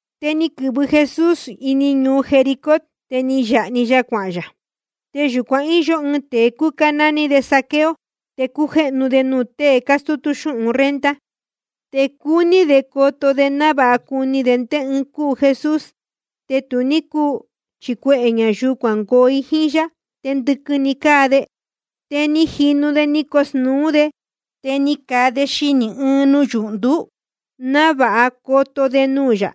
Te ni quɨ̄vɨ Jesús ini ñuu Jericó, te ni yāha‑ni ya cuahān yā. Te yūcuan íyó ɨɨn tēe cúcá nání de Zaqueo, te cújéhnu de nuū tée cástútú xúhun renta. Te cúní de coto de návāha cuni de ndé ɨɨn cúu Jesús. Te tu ní cúu, chi cuehē ñayuu cuangoo i jíín yá, te ndɨquɨ‑ni cáa de. Te jínu de ni cosnūú de. Te ni caa de xinī ɨɨn nuyūhndú návāha coto de nuū yā,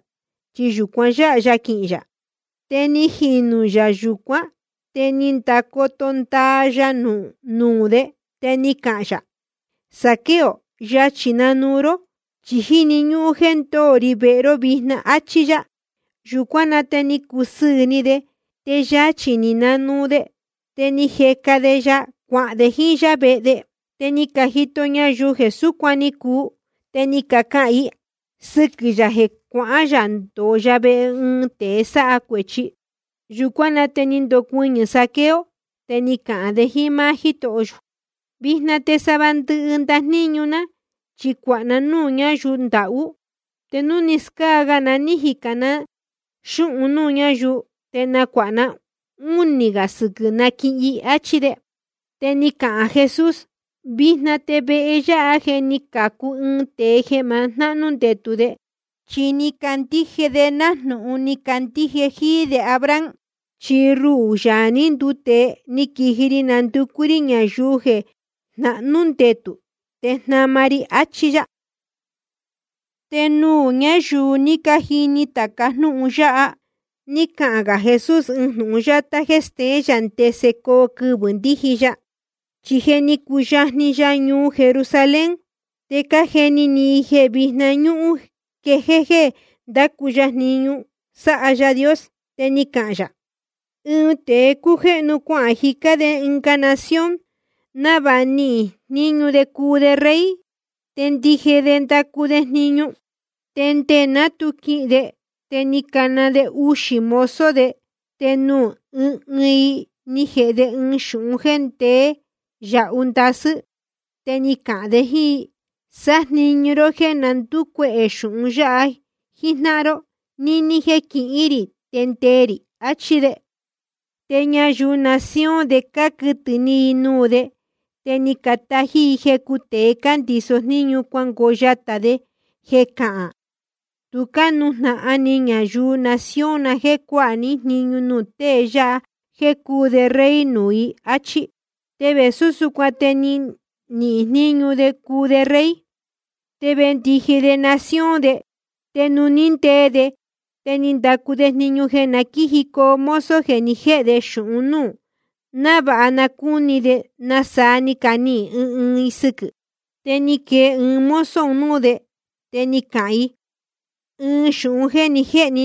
chi yūcuan yáha ya quihīn yā. Te ni jinū yā yūcuán, te ni ndacoto ndaa ya nuū de. Te ni cahān yā: Zaqueo, yachī nuu ró, chi jíni ñúhún jéē ndóo ri vehe ró vijna, áchí yá. Yūcuán na te ni cusɨɨ̄ ni de, te yachī ni nanuu de, te ni jeca de ya cuahān de jíín yá vehe de. Te ni cajito ñayuu jeē súcuan ni cuu, te ni cacahān i sɨquɨ̄ yā jeē cuahán yā ndōo ya vehe ɨɨn tēe sáha cuēchi. Yūcuán na te ni ndocuɨñɨ̄ Zaqueo, te ni cahān de jíín máá Jítoho yō: Vijna te sava ndɨhɨ ndajníñu ná chi cuāha ná núū ñáyuu ndahú. Te núu ni scáa ga na ní jicān na xúhun nuū ñáyuu, te nacuāha ná únī gā sɨquɨ̄ naquihin i, áchí de. Te ni cahān Jesús: Vijna te vehe yáha je ni cācu ɨɨn tēe jeē ma jnahnú ndetū de, chi ni candíje de nájnūhun ni candíje jíí de Abraham. Chi ruhū, Yaā ní nduu tēe, ni quiji ri nducú rí ñayuu jeē jnahnú ndetū, te jnama ri i, áchí yá. Te nuū ñáyuu ní cajini tāca jnúhun yáha, ní cahān gā Jesús ɨɨn jnūhun yátá jéē steén yā ndese coo quɨvɨ̄ ndíji ya. Chi je ni cuyajni ya ñuu Jerusalén, te cájeni ni i jeē víjna ñúhún quejéé jéē ndácu ya jniñu sáha Yaā Dios. Te ni cahān yā: Ɨɨn tēe cújéhnu cuahān jicá de ɨnga nación, návāha nihīn jníñu de cuu de rey, te ndiji de ndacu de jniñu. Te nde ná tu quihīn de, te ni cana de uxī mozo de, te nuū ɨɨn ɨɨn i ni jēhe de ɨɨn xūhun jéē ndeé yahu ndasɨ́. Te ni cahān de jíín i: Sájniñu ró jéē na ndúcuehē xūhun yáha jíjnáhan ró níní jéē quihín rī te ndee rī, achí de. Te ñayuu nación de cáquɨtɨ̄ ni i nuū de, te ni catají i jecu tēe cándiso jníñu cuangoo yatā de jeē cahān: Tu cánujnahan ni ñayuu nación na jéē cuáha ní jniñu nuū tée yáha jéē cuu de rey nuū i, áchí. Te vēsú súcuan te ni nihīn jníñu de cuu de rey, te vendiji de nación de. Te nuū ní ndee de, te ni ndacu de jniñu jeē na quíjicoo mozo jeē ni jéhe de xūhun núū, návāha na cúni de nasaa ni canihīn ɨɨn ɨɨn i sɨquɨ̄. Te ni quee ɨɨn mozo un núū de, te ni cahān i: Ɨɨn xūhun jéē ni jéhe ní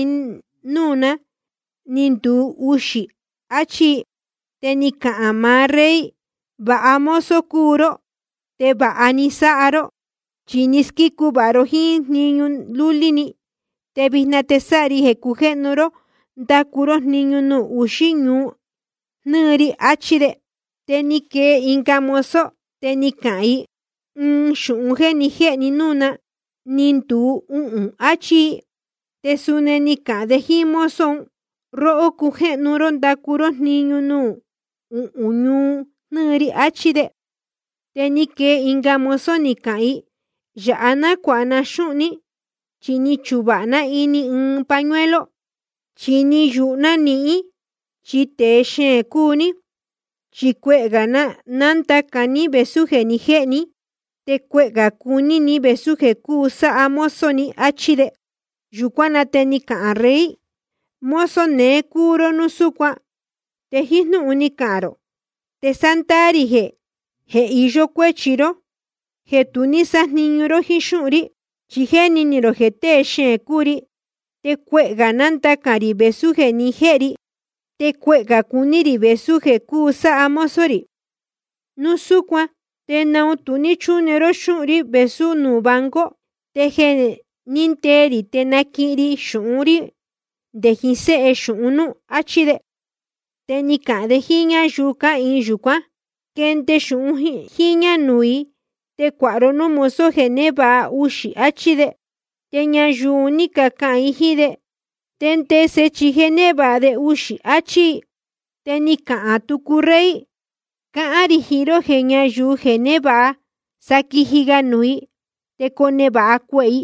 núū ná, ni nduu uxī, achí i. Te ni cahān maá rey: Vāha mozo cúu ró, te vāha ni sáha ró. Chi ni squícu vāha ró jíín ɨɨn jniñu lúlí‑ni, te vijna te sáha ri jeē cujéhnu ró ndacu ró jniñu nuū uxí ñuu jnɨ́ɨ ri, achí de. Te ni quee ɨnga mozo, te ni cahān i: Ɨɨn xūhun jéē ni jéhe ní núū ná, ni nduu uhūn, achí i. Te suni ni cahān de jíín mozo un: Róhó, cujéhnu ró ndacu ró jniñu nuū uhún ñuu jnɨ́ɨ ri, achí de. Te ni quee ɨnga mozo, ni cahān i: Yāha nácuāha ná xúhun ní, chi ni chuvāha ná ini ɨɨn pañuelo. Chi ni yūhu ná nihín, chi tēe xeēn cúu ní. Chi cuehē gā nándacān ní vēsú jeē ni jéhe ní, te cuehē gā cuní ni vēsú jeē cúu sáha mozo ni, áchí de. Yūcuán na te ni cahān rey: Mozo neé cúu ró núu súcuan, te jíín jnúhun ni cahān rō te sándaā rī jeē iyó cuéchi ró jéē tu ní sájniñu ró jíín xúhun rí. Chi jéni ni rō jeē tée xeēn cúu ri, te cuehē gā nándacān rī vēsú jeē ni jéhe ri, te cuehē gā cuní rī vēsú jeē cúu sáha mozo rī. Núu súcuan ¿te naun tu ní chúne ró xúhun rí vēsú nuū banco? Te jeē ní ndee rī te naquihin ri xūhun rí nde jiín séhe xūhun núú. Achí de. Te ni cahān de jíín ñáyuu cáhīin yūcuán: Quende xūhun jíñā nuū i, te cuāha ró núū mozo jeē névāha uxī, achí de. Te ñayuu un ní cacahān i jíín de: Te ndese, chi je névāha de uxī, achí i. Te ni cahān tucu rey: Cáhán rī jiín ró jeē ñáyuu je névāha, sa quiji ga nuū i, te conevāha cuehē i.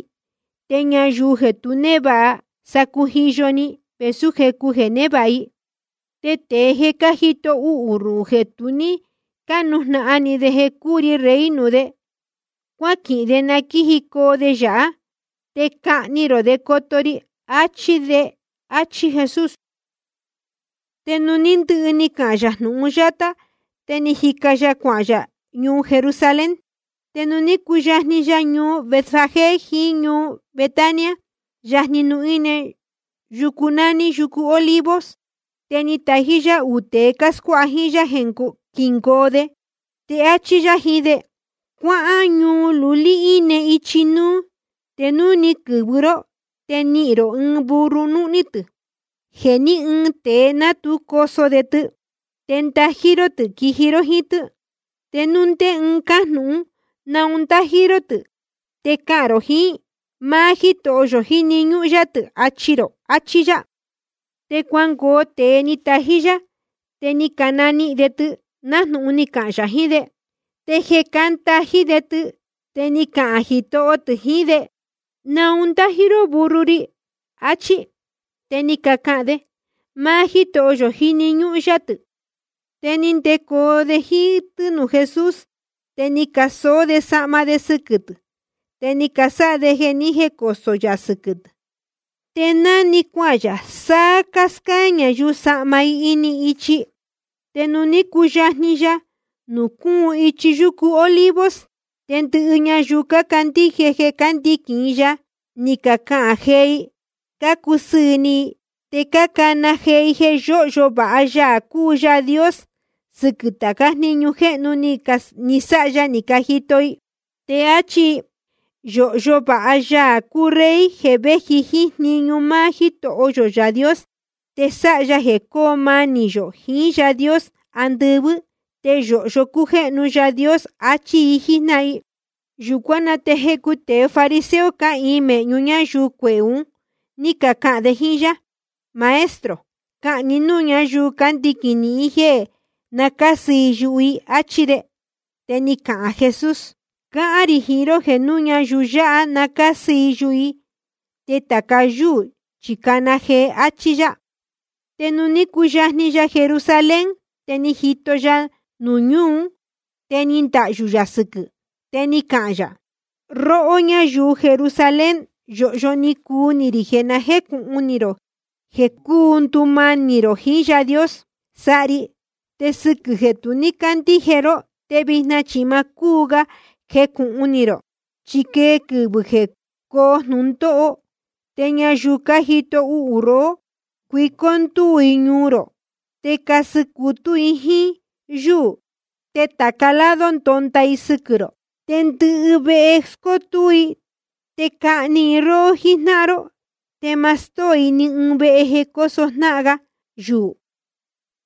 Te ñayuu jeē tu névāha, sa cujiyo‑ni vēsú jecu jeē névāha i. Te tēe jeē cájito uhū ruhū, jeē tu ní cánujnahan ni de jeē cuu ri rey nuū de, cuáquihin de na quíjicoo de yāhá. Te cahni rō de coto ri, achí de. Achí Jesús. Te nuū ní ndɨhɨ ni cahān yā jnūhun yáha, te ni jica ga yā cuahān yā ñuu Jerusalén. Te nuū ní cuyajni ya ñuu Betfagé jiín ñuu Betania, yajni nuū íne yucu nání yucu Olivos, te ni tají yá uū tēe cáscuáha jíín yá jeē quíngoo de. Te áchí yá jiín de: Cuáhán ñuu lulí íne ichi núú. Te núu ni quɨ̄vɨ ró, te nihīn rō ɨɨn burro núhní tɨ̄, jeē ní ɨɨn tēe ná tu coso de tɨ. Te ndají ró tɨ̄ quiji ró jíín tɨ́. Te núu ndé ɨɨn cajnūhún naun cándají ró tɨ̄, te cahān rō jiín: Máá Jítoho yō jíni ñúhún yá tɨ̄, achi rō. Achí yá. Te cuangoo tēe ni tají yá, te ni canihīn de tɨ nájnūhun ni cahān yā jiín de. Te jeē cándají de tɨ, te ni cacahān jitoho tɨ̄ jiín de: ¿Naun cándají ró burro ri? achí. Te ni cacahān de: Máá Jítoho yō jíni ñúhún yá tɨ̄. Te ni ndecoo de jíín tɨ́ nuū Jesús. Te ni casoó de sahma de sɨquɨ̄ tɨ̄, te ni casáha de jeē ní jecosō yā sɨquɨ̄ tɨ̄. Te ná‑ni cuahān yā, sáá cáscáá ñayuu sahma i ini ichi. Te nuū ní cuyajni ya nuū cúun ichi yucu Olivos, te ndɨhɨ ñayuu cácandíje jeē cándiquīn i ya, ni caquejéé i cácusɨɨ̄ ni i, te cácana jee i jeē yóhyo vāha Yaā cúu Yaā Dios sɨquɨ̄ tācá jniñu jéhnu ni sáha ya ni cajito i. Te áchí i: Yōhyo vāha Yaā cúu Rey jeē véji jíín jniñu máá Jítoho yō Yaā Dios. Te sáha ya jeē cóo manī yō jiín Yaā Dios andɨvɨ́. Te yōhyo cújéhnu Yaā Dios, achí i jíjnáhan i. Yūcuán na te jecu tēe fariseo cáhīin mēhñu ñáyuu cuehē ún, ní cacahān de jíín yá: Maestro, cahān ni núū ñáyuu cándiquīn nihín jéē na cásɨ i yuhu i, áchí de. Te ni cahān Jesús: Cáhán rī jiín ró jeē núu ñayuu yáha na cásɨ i yuhu i, te tāca yúū chi cana jee, áchí yá. Te nuū ní cuyajni ya Jerusalén, te ni jito ya ñuu ún, te ni ndahyū yā sɨquɨ̄. Te ni cahān yā: Róhó ñáyuu Jerusalén, yōhyo ni cuu ni rī jeē na jécūhun ni rō jeē cuu ndumanī rō jiín Yaā Dios sáha ri. Te sɨquɨ̄ jeē tu cácandíje ró, te vijna chi ma cúu ga jecūhun ni rō. Chi quee quɨvɨ̄ jeē coo jnūndóho, te ñayuu cájito uhū rohó, cuicó ndúū i ñuu rō, te casɨ cutú i jíín yúū, te tāca lado ndonda i sɨquɨ̄ rō. Te ndɨhɨ vehe scótúú i, te cahni i róhó jíjnáhan ró. Te ma stóo i ni ɨɨn vehe jeē cóso jnáhan ga yuū.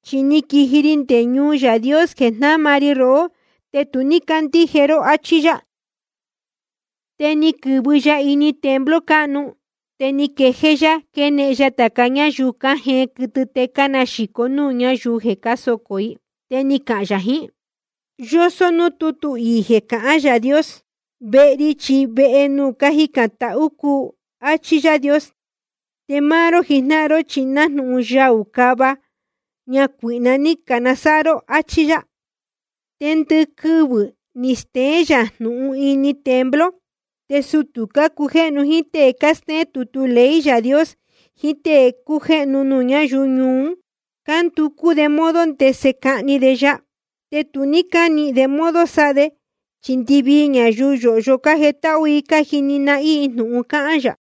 Chi ni quiji ri nde nuū Yaā Dios jeē jnáma ri rohó, te tu ní cácandíje ró. Achí yá. Te ni quɨ̄vɨ ya ini templo cáhnu, te ni quejéé yá quénehen ya tāca ñáyuu cájeen quɨtɨ te cánaxīco núū ñáyuu jeē socō i. Te ni cahān yā jiín i: Yósó núū tútu iī jeē cahán Yaā Dios: Vehe ri chi vehe nuū cájicān tahú cúu, áchí Yaā Dios. Te máá ró jijnáhan ró, chi nájnūhun yaū cava ñacuīhna ní canasáha ró, áchí yá. Te ndɨquɨvɨ̄ ni steén yā jnūhun ini templo. Te sutū cácujéhnu jíín tée cástéén tutu ley Yaā Dios jiín tée cácujéhnu nuū ñáyuu ñuu ún, cánducú de modo ndese cahni de ya. Te tu cánihīn de modo sáha de, chi ndɨvii ñayuu yōhyo cájetáhú i cájini nahín i jnūhun cáhán yā.